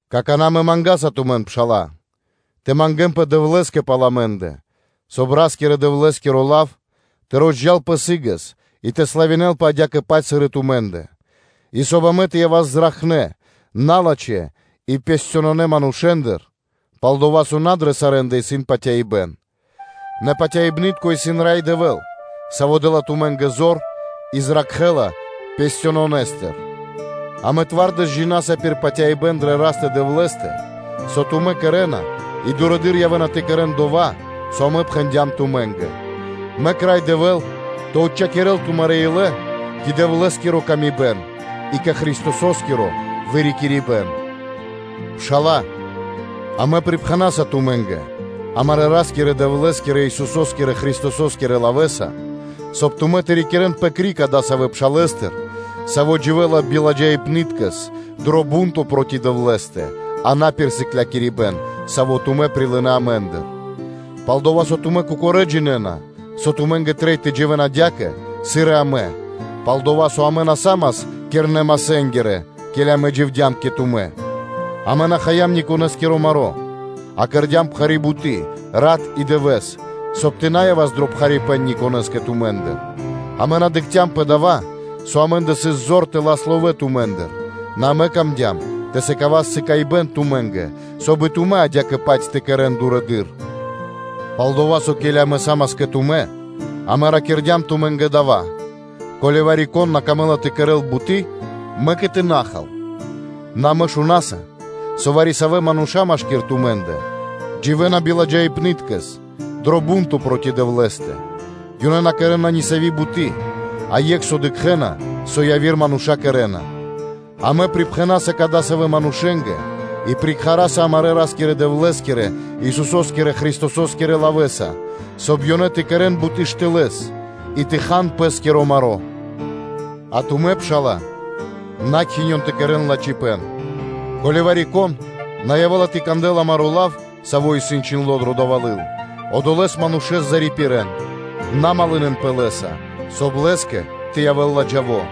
Какана́, амэ мангаса тумэн, пшала́лэ, тэ мангэ́нпэ Дэвлэ́скэ пал амэ́ндэ, соб (кай) Ра́скирэ-Дэвлэ́скиро лав тэ розджалпэ сы́гэс и тэ славинэлпэ адя́кэ-паць, сыр и тумэ́ндэ; и соб (кай) амэ тэ явас зракхнэ́ налачхэ́ и хоханэ́ манушэ́ндыр, пал-дова́ со на дрэ сарэ́ндэ исын патяибэ́н. Нэ патяибны́тко исын Рай Дэвэ́л, Саво́ дэ́ла тумэ́нгэ зор и зракхэ́ла налачхэстыр. Амэ би кунипнаскиро (твардэс) джина́са пир патяибэ́н дрэ Растэ – Дэвлэ́стэ, со тумэ́ кэрэ́на и дурэды́р явэ́на тэ кэрэ́н дова́, со амэ пхэндям тумэ́нгэ. Мэк Рай Дэвэ́л тэ отчхакирэл тумарэ́ илэ кэ Дэвлэ́скири ла́ска и кэ Христосо́скиро вырикирибэн. Пшала́лэ, амэ припхэнаса тумэ́нгэ, амарэ́ Ра́скирэ-Дэвлэ́скирэ, Исусо́скирэ Христосо́скирэ лавэ́са, соб (кай) тумэ́ тэ рикирэнпэ криг адасавэ́ пшалэстыр, саво́ дживэ́ла на кэри буты́, а на пир сыклякирибэ́н, саво́ тумэ́ прилынэ́ амэ́ндыр. Пал-дова́ со тумэ́ кокорэ́ джинэ́на, со тумэ́нгэ трэй тэ дживэ́н адя́кэ, сыр и амэ, пал-дова́ со амэ на са́мас кирнэ-масэнгирэ, ке́ли амэ дживдям кэ тумэ́; амэ на хаям никонэскиро маро́, а кэрдя́м пхари́ буты́ рат и дывэ́с, соб (кай) тэ на явас дро пхарипэ́н никонэ́скэ тумэ́ндыр: амэ на дыкхцям пэ дава́, со амэ́ндэ сыс зор тэ лас ловэ́ тумэ́ндыр, нэ амэ камдям тэ сыкавас приме́ро (сыкаибэ́н) тумэ́нгэ, соб (кай) и тумэ́ адя́кэ-паць тэ кэрэ́н дурэды́р. Пал-дова́ со, ке́ли амэ са́мас кэ тумэ́, амэ ракирдям тумэ́нгэ дава́: “Ко́ли вари-кон на камэ́ла тэ кэрэ́л буты́, мэк и тэ на хал.” Нэ амэ шунаса, со вари-савэ́ мануша́ машки́р тумэ́ндэ дживэ́на биладжаипныткэс дро бу́нто проти Дэвлэ́стэ: ёнэ на кэрэ́на нисави́ буты́, а екх со дыкхэ́на, со яви́р мануша́ кэрэ́на. Амэ припхэнаса кадасавэ́ манушэ́нгэ и приракхаса амарэ́ Ра́скирэ-Дэвлэ́скирэ, Исусо́скирэ Христосо́скирэ лавэ́са, соб (кай) ёнэ тэ кэрэ́н буты́ штылэ́с и тэ хан пэ́скиро маро́. А тумэ́, пшала́лэ, на кхинён тэ кэрэ́н лачхипэ́н. Ко́ли вари-кон на явэ́ла тэ кандэл амаро́ лав, саво́ исын чхиндло́ дро дава́ лыл, одолэ́с манушэ́с зарипирэн, на малынэнпэ (на дружынэн) лэ́са, соб (кай) лэ́скэ тэ явэ́л ладжаво;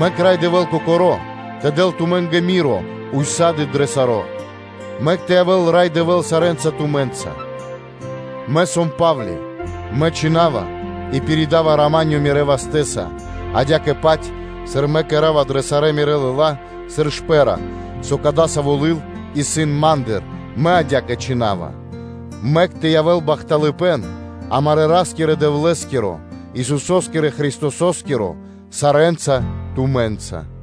Мэк Рай Дэвэ́л Кокоро́, тэ дэл тумэ́нгэ рама́нё (миро) ўса́ды (сак) дро саро́. Мэк тэ явэ́л Рай Дэвэ́л сарэ́нца тумэ́нца. Мэ сом Па́вли, мэ чхина́ва и пиридава “рама́нё” мирэ́ вастэ́са, адя́кэ-паць, сыр мэ кэра́ва дрэ сарэ́ мирэ́ лыла́ сыр шпэ́ра (знако), со кадава́ лыл исын ма́ндыр, мэ адя́кэ чхина́ва: Мэк тэ явэ́л бахталыпэ́н амарэ́ Ра́скирэ-Дэвлэ́скиро, Исусо́скирэ Христосо́скиро сарэ́нца тумэ́нца. Ами́нь.